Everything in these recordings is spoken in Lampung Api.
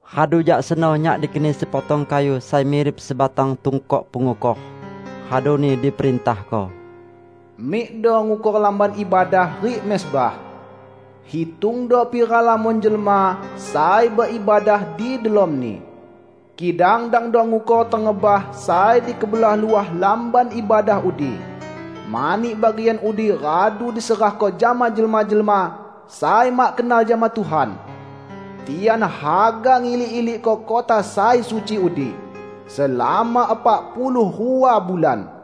Radu jak seno nyak dikeni sepotong kayu sai mirip sebatang tungkok pengukor, raduni diperintahko, "Mikdo ngukor Lamban Ibadah rik mezbah. Hitungdo pira lamon jelma sai beibadah di delomni. Kidang dangdo ngukor tengebah sai di kebelah luah Lamban Ibadah udi, mani bagian udi radu diserahko jama jelma-jelma sai mak kenal jama Tuhan. Tian haga ngilik-ilikko kota sai suci udi selama epak puluh rua bulan.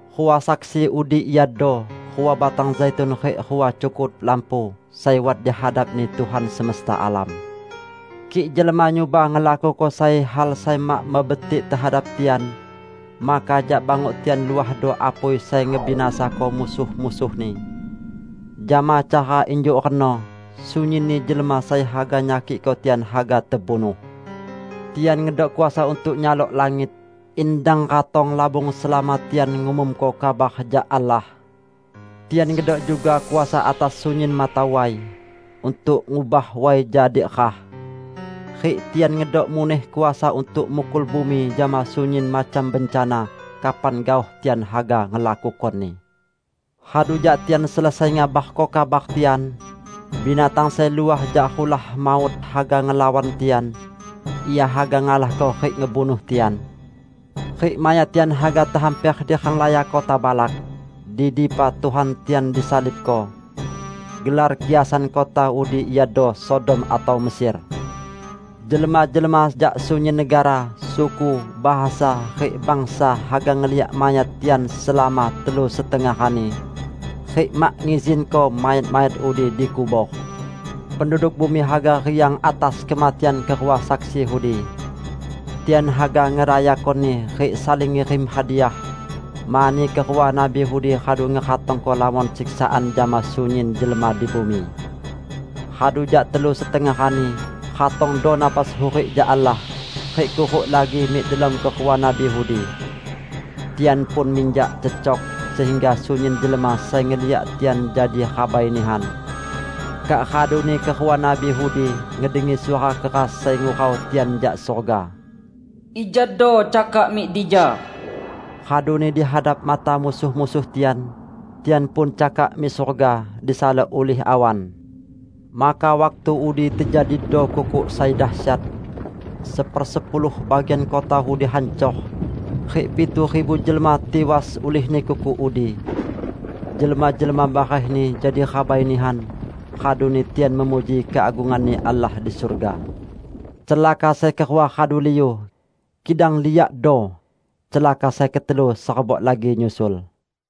Rua saksi udi iado rua batang zaitun rik rua cukut lampu sai wat di hadap-Ni Tuhan semesta alam. Kik jelma nyuba ngelakuko sai hal sai mak mebetik tehadap tian, maka jak banguk tian luahdo apui sai ngebinasako musuh-musuhni. Jama cara injuk reno, sunyinni jelma sai haga nyakikko tian haga tebunuh. Tian ngedok kuasa untuk nyalok langit in dang ratong labung selama tian ngumumko kabar jak Allah. Tian ngedok juga kuasa atas sunyin mata way, untuk ngubah way jadi rah. Rik tian ngedok muneh kuasa untuk mukul bumi jama sunyin macam bencana, kapan gaoh tian haga ngelakukoni. Radu jak tian selesai ngabarko kabar tian, binatang sai luah jak rulah maut haga ngelawan tian. Ia haga ngalahko rik ngebunuh tian. Rik mayat tian haga tehamper di renglaya kota balak, di dipa Tuhan tian disalibko. Gelar kiasan kota udi iado Sodom atau Mesir. Jelma-jelma jak sunyin negara, suku, bahasa, rik bangsa haga ngeliak mayat tian selama telu setengah rani, rik mak ngizinko mayat-mayat udi dikubor. Penduduk bumi haga riang atas kematian kerua saksi udi. Tian haga ngerayakoni rik saling ngirim hadiah, mani kerua nabi udi radu ngeratongko lamon siksaan jama sunyin jelma di bumi. Radu jak telu setengah rani, ratongdo napas hurik jak Allah rik kuruk lagi mik delom kerua nabi udi. Tian pun minjak cecok, sehingga sunyin jelma sai ngeliak tian jadi rabai nihan. Kak raduni kerua nabi udi ngedengi suara keras sai ngurau tian jak surga, "Ijado cakak mik dija!" Raduni di hadap mata musuh-musuh tian, tian pun cakak mik surga, disalok ulih awan. Maka waktu udi tejadido kukuk sai dasyat. Sepersepuluh bagian kota udi hancor, rik pitu ribu jelma tiwas ulihni kukuk udi. Jelma-jelma barehni jadi rabai nihan, raduni tian memuji keagungan-Ni Allah di surga. Celaka sai kerua radu liu. Kidang liakdo! Celaka sai ketelu serebok lagi nyusul.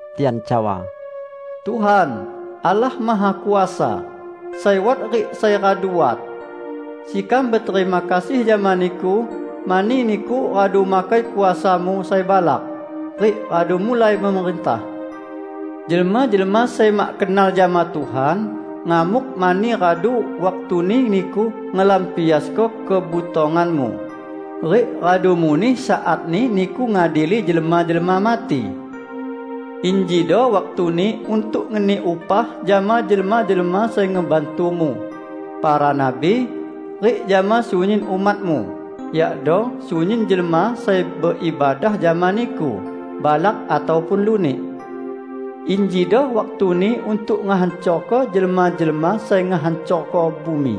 Tian cawa, "Tuhan, Allah Mahakuasa, sai wat rik sai radu wat! Sekam beterima kasih jama Niku mani Niku radu makai kuasa-Mu sai balak, rik radu mulai memerintah! Jelma-jelma sai mak kenal jama Tuhan, ngamuk mani radu waktuni Niku ngelampiasko kebutongan-Mu, rik radu muneh saatni Niku ngadili jelma-jelma mati. Injido waktuni untuk ngeni upah jama jelma-jelma sai ngebantu-Mu, para nabi, rik jama sunyin umat-Mu, yakdo sunyin jelma sai beibadah jama Niku, balak ataupun lunik. Injido waktuni untuk ngehancorko jelma-jelma sai ngehancorko bumi!"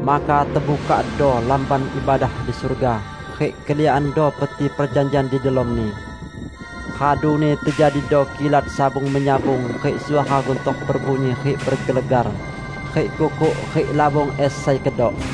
Maka tebukakdo Lamban Ibadah di surga, rik keliakando Peti Perjanjian di delomni. Raduni tejadido kilat sabung-menyabung rik suara guntor bebunyi rik bergelegar, rik kukuk rik labung es sai kedok.